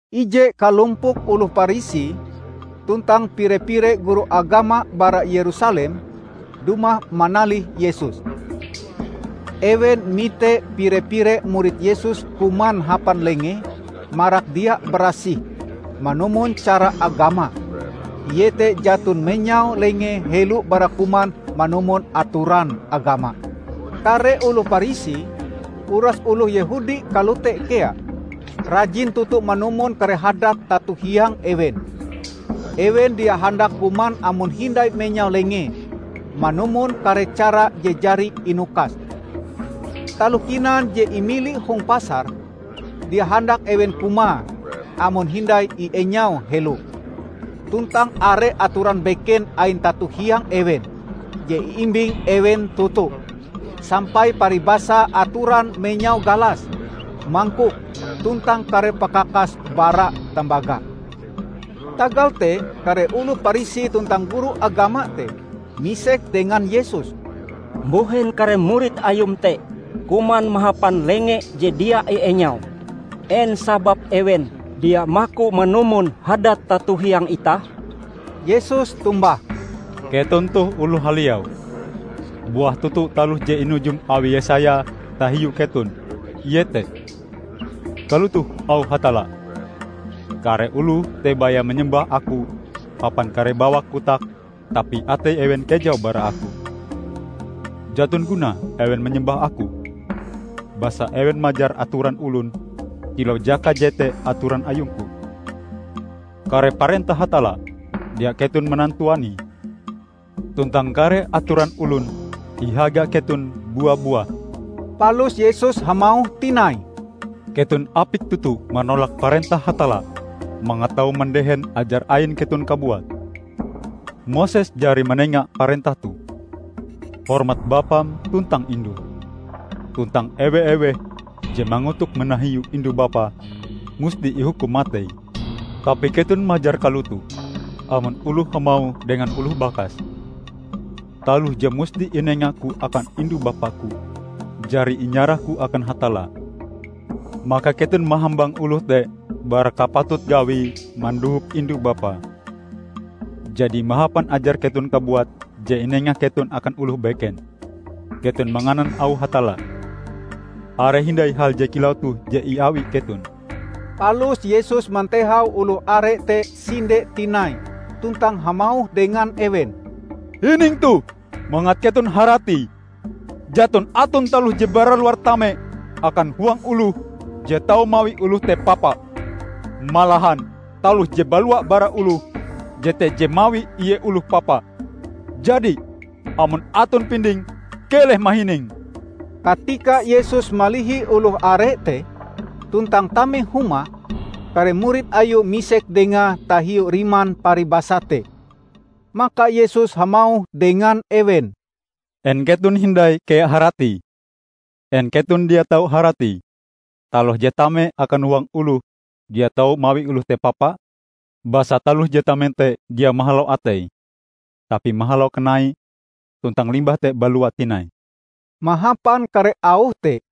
Ije kalompok oloh Parisi tuntang pire-pire guru agama bara Yerusalem, dumah manalih Yesus. Ewen mite pire-pire murid Yesus kuman hapan lengee marak dia barasih manumon cara agama, iete jaton menyau lengee helo bara kuman manumon atoran agama. Kare oloh Parisi, uras oloh Yehudi kalote kea, rajin toto manumon kare hadat tato hiang ewen. Ewen dia handak kuman amon hindai menyau lengee manumon kare cara je jari inukas. Taloh kinan je imili hong pasar, dia handak ewen kumae amon hindai ienyau helo. Tuntang are atoran beken ain tato hiang ewen je iimbing ewen toto; sampai paribasa atoran menyau galas, mangkok, tuntang kare pakakas bara tambaga. Tagal te kare oloh Parisi tuntang guru agama te misek dengan Yesus, "Mbuhen kare murid Ayum te kuman mahapan lenge je dia ienyau? En sababe ewen dia maku manumon hadat tato hiang itah?" Yesus tombah, "Keton toh oloh haliau! Buah toto taloh je inujum awi Yesaya tahiu keton, iete, 'Kalotoh auh Hatalla, Kare oloh te baya manyembah Aku hapan kare bawak kotake tapi atei ewen kejau bara Aku. Jaton gunae ewen manyembah Aku, basa ewen majar atoran olon kilau jaka jete atoran ayung-Ku!' Kare parentah Hatalla dia keton manantuanie, tuntang kare atoran olon ihaga keton bua-buah." Palus Yesus hamauh tinai, "Keton apik toto manolak parentah Hatalla mangat tau mandehen ajar ain keton kabuat. Moses jari manenga parentah toh, 'Hormat bapam tuntang indum,' tuntang 'Ewe-eweh je mangotok manahiu indu-bapae, musti ihukum matei.' Tapi keton majar kalotoh: Amon oloh hamauh dengan oloh bakase, 'Taloh je musti inengaku akan indu-bapaku, jari inyarahku akan Hatalla,' maka keton mahambang oloh te bara kapatut gawie mandohop indue-bapae. Jadi mahapan ajar keton kabuat je inenga keton akan oloh beken, keton manganan auh Hatalla. Are hindai hal je kilau toh je iawi keton." Palus Yesus mantehau oloh are te sinde tinai tuntang hamauh dengan ewen, "Hining toh mangat keton haratie! Jaton aton taloh je bara luar tame akan huang oloh je tau mawi oloh te papa. Malahan, taloh je balua bara oloh, jete je mawi ie oloh papa. [ Jadi, amon aton pinding, keleh mahining.]" Katika Yesus malihi oloh are te tuntang tame huma, kare murid Ayue misek Dengae tahiu riman paribasa te. Maka Yesus hamauh dengan ewen, "En keton hindai kea haratie? En keton dia tau haratie taloh je tame akan huang oloh dia tau mawi oloh te papa? Basa taloh je tame te dia mahalau atei, tapi mahalau kanai, tuntang limbah te balua tinai." Mahapan kare auh te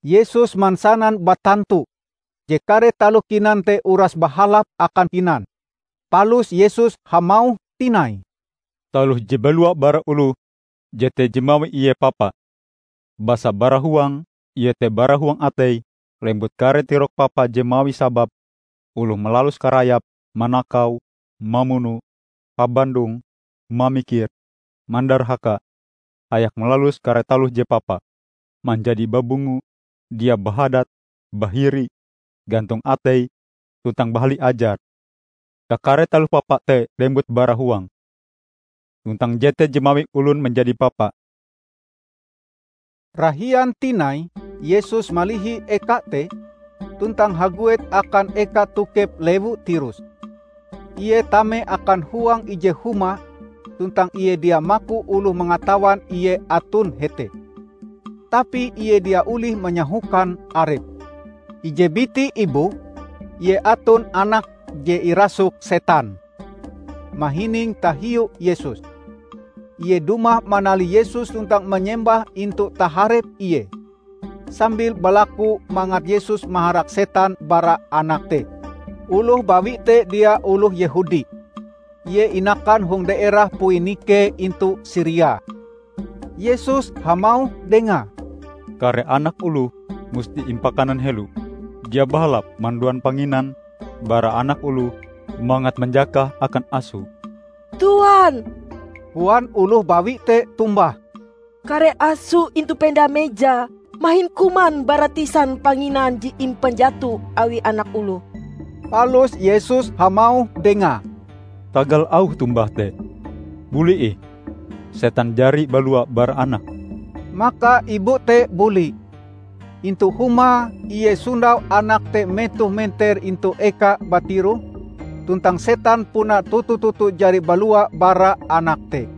Yesus mansanan batantu je kare taloh kinan te uras bahalap akan kinan. Palus Yesus hamauh tinai, "Taloh je balua bara oloh, jete je mawi ie papa. Basa bara huang, iete bara huang atei, lembut kare tirok papa je mawi sabab oloh malalus karayap, manakau, mamuno, habandong, mamikir, mandarhaka, hayak malalus kare taloh je papa, manjadi babungo, dia bahadat, bahiri, gantong ateie tuntang bahali ajare. Kakare taloh papa te lembut bara huang, tuntang jete je mawi olon manjadi papa." Rahian tinai Yesus malihi eka te, tuntang haguet akan eka tokep lewu Tirus. Ie tame akan huang ije huma tuntang Ie dia maku oloh mangatawan Ie aton hete. Tapi Ie dia olih manyahokan arepe. Ije biti ibu, ie aton anake je irasuk setan, mahining tahiu Yesus. Ie dumah manalih Yesus tuntang manyembah intu taharep Ie, sambil balaku mangat Yesus maharak setan bara anake te. Oloh bawi te dia oloh Yehudi, ie inakan hong daerah Poinike intu Siria. Yesus hamauh dengae, "Kare anak oloh musti impakanan helo. Dia bahalap manduan panginan bara anak oloh mangat manjakahe akan aso." "Tuan," koan oloh bawi te tombah, "Kare aso intu penda meja mahin kuman bara tisan panginan je impanjato awi anak oloh!" Palus Yesus hamauh dengae, "Tagal auh tombahm te, buli ih; setan jari balua bara anakm!" Maka ibu te buli. Intu humae, ie sondau anake te metoh menter intu ekae batiroh, tuntang setan puna toto-toto jari balua bara anak te.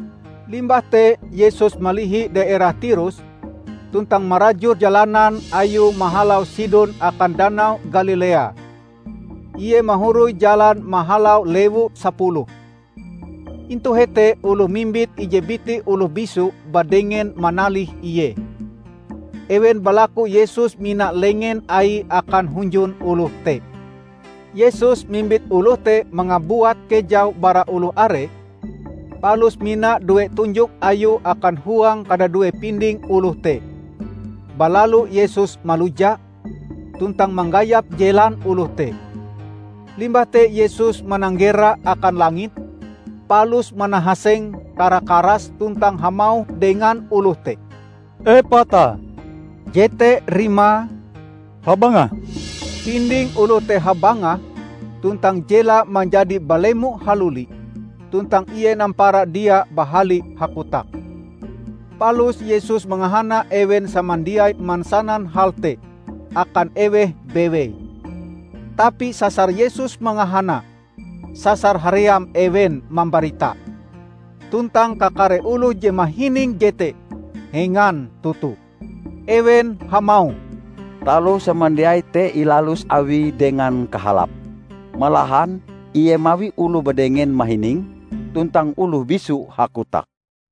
Limbah te Yesus malihi daerah Tirus, tuntang marajur jalanan Ayue mahalau Sidon akan Danau Galilea. Ie mahoroi jalan mahalau Lewu Sapuluh. Intu hete oloh mimbit ije biti oloh bisu badengen manalih Ie. Ewen balaku Yesus mina lengen Aie akan hunjun oloh te. Yesus mimbit oloh te mangabuat kejau bara oloh are palus mina due tunjok Ayue akan huang kadadue pinding oloh te. Balalu Yesus maluja, tuntang manggayap jelan oloh te. Limbah te Yesus mananggera akan langit, palus manahaseng kara-karas tuntang hamauh dengan oloh te, "Epata," jete rimae, "Habangah!" Pinding oloh te habangah tuntang jelae manjadi balemo haluli, tuntang ie nampara dia bahali hakotak. Palus Yesus mangahana ewen samandiai mansanan hal te akan eweh bewei. Tapi sasar Yesus mangahana, sasar haream ewen mambaritae. Tuntang kakare oloh je mahining jete hengan toto. Ewen hamauh, "Taloh samandiai te ilalus Awie dengan kahalape! Malahan Ie mawi oloh badengen mahining tuntang oloh bisu hakotak!"